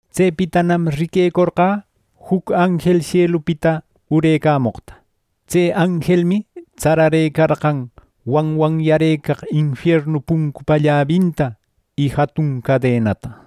Tsepitanam riquecorqä juc anjel sielupita urecamoqta. Tse anjelmi tsararëcarqan wanwanyarëcaq infiernu puncupa llabinta y jatun cadenata.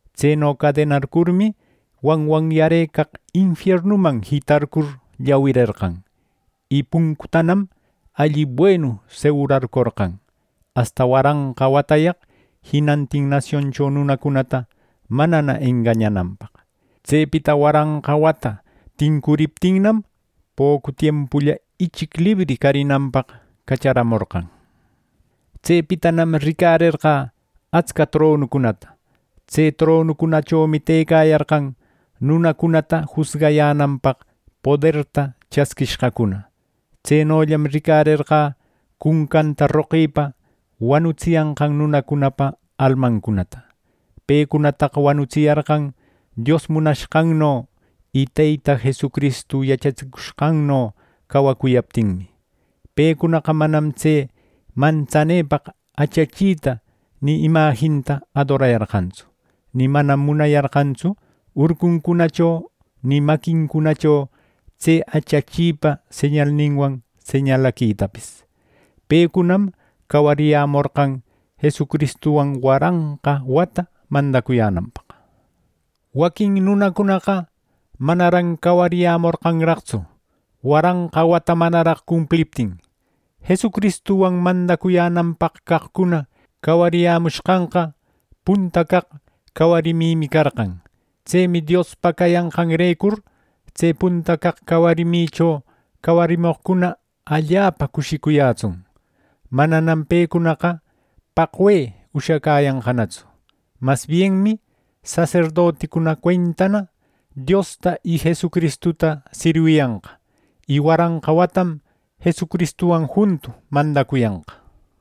Tseno cadenarcurmi, wanwanyarëcaq infiernuman jitarcur llawirerqan; y puncuntanam alli buenu segurarcorqan, asta waranqa watayaq jinantin nasioncho nunacunata manana engañananpaq. Tsepita waranqa wata tincuriptinnam, pocu tiempulla ichic libri carinanpaq cacharamorqan. Tsepitanam ricarerqä atsca tronucunata. Tse tronucunachomi tëcayarqan nunacunata jusgayänanpaq poderta chasquishqacuna. Tsenollam ricarerqä cuncanta roqïpa wanutsiyanqan nunacunapa almacunata. Pecunataqa wanutsiyarqan Dios munashqanno y Teyta Jesucristu yachatsicushqanno cawacuyaptinmi. Pecunaqa manam tse mantsanepaq achachita ni imajinninta adorayarqantsu, ni manam munayarqantsu urcuncunacho, ni maquincunacho tse achachipa señalninwan señalaquitapis. Pecunam cawariyämorqan Jesucristuwan waranqa wata mandacuyänanpaq. Waquin nunacunaqa manaran cawariyämorqanraqtsu waranqa wata manaraq cumpliptin. Jesucristuwan mandacuyänanpaq caqcuna cawariyämushqanqa, punta caq cawarimimi carqan. Tsemi Diospa cayanqanrecur tse punta caq cawarimicho cawarimoqcuna ¡Allapa cushicuyätsun! Mananam pecunaqa paqwe ushacäyanqanatsu. Mas bienmi saserdoticuna cuentana Diosta y Jesucristuta sirwiyanqa, y waranqa watam Jesucristuwan juntu mandacuyanqa.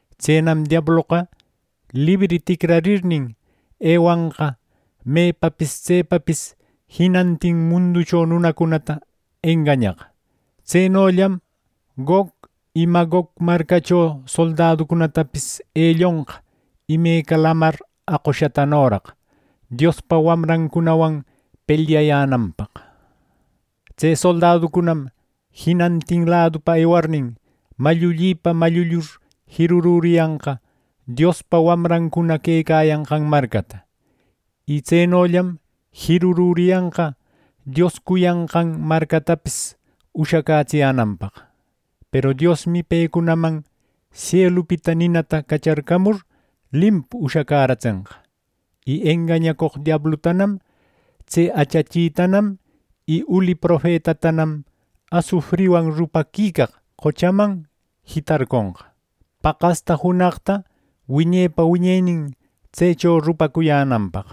Tsenam diabloqa libri ticrarirnin, ewanqa mepapis tsepapis jinantin munducho nunacunata engañaq. Tsenollam Gog y Magog marcacho soldaducunatapis elliconqa imeca lamar aqushatanoraq, Diospa wamrancunawan pelyayänanpaq. Tse soldaducunam jinantin ladupa ewarnin, mallullipa mallullur jirururiyanqa Diospa wamrancuna quecayanqan marcata. Y tsenollam jirurüriyanqa Dios cuyanqan marcatapis ushacätsiyänanpaq. Peru Diosmi pecunaman sielupita ninata cacharcamur, limpu ushacäratsenqa. Y engañacoq diablutanam, tse achachitanam y uli profetatanam asufriwan rupaquicaq qochaman jitarconqa, paqasta junaqta wiñepa wiñenin tsecho rupacuyänanpaq.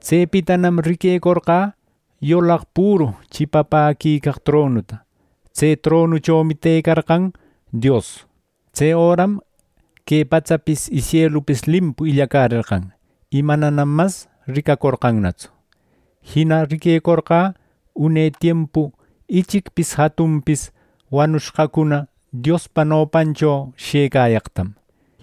Tsepitanam riquecorqä yulaq püru chipapäquicaq tronuta. Tse tronuchomi tëcarqan Dios. Tse öram que patsapis y sielupis limpu illacärerqan, y manam mas ricacorqannatsu. Jina riquecorqä une tiempu ichicpis jatunpis wanucushqacuna Diospa nopancho shëcayaqtam.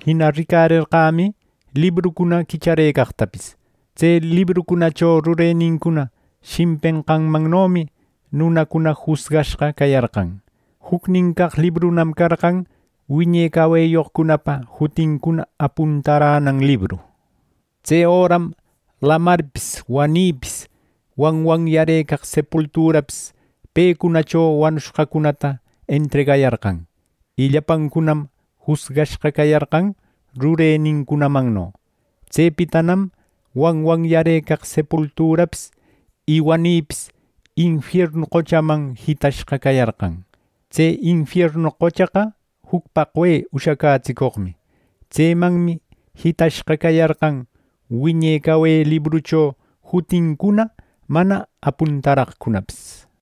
Jina ricarerqämi librucuna quichacäreqtapis. Tse librucunacho rurenincuna shimpenqanmannomi nunacuna jusgashqa cayarqan. Jucnin caq librunam carqan wiñe caweyoqcunapa jutincuna apuntaränan libru. Tse öram lamarpis, wanïpis, wanwanyarëcaq sepulturapis pecunacho wanushqacunata entregayarqan, y llapancunam jusgashqa cayarqan rurenincunamanno. Tsepitanam wanwanyarëcaq sepulturapis y wanïpis infiernu qochaman jitashqa cayarqan. Tse infiernu qochaqa juc paqwe ushacätsicoqmi. Tsemanmi jitashqa cayarqan, wiñe cawe librucho jutincuna mana apuntaraqcunapis.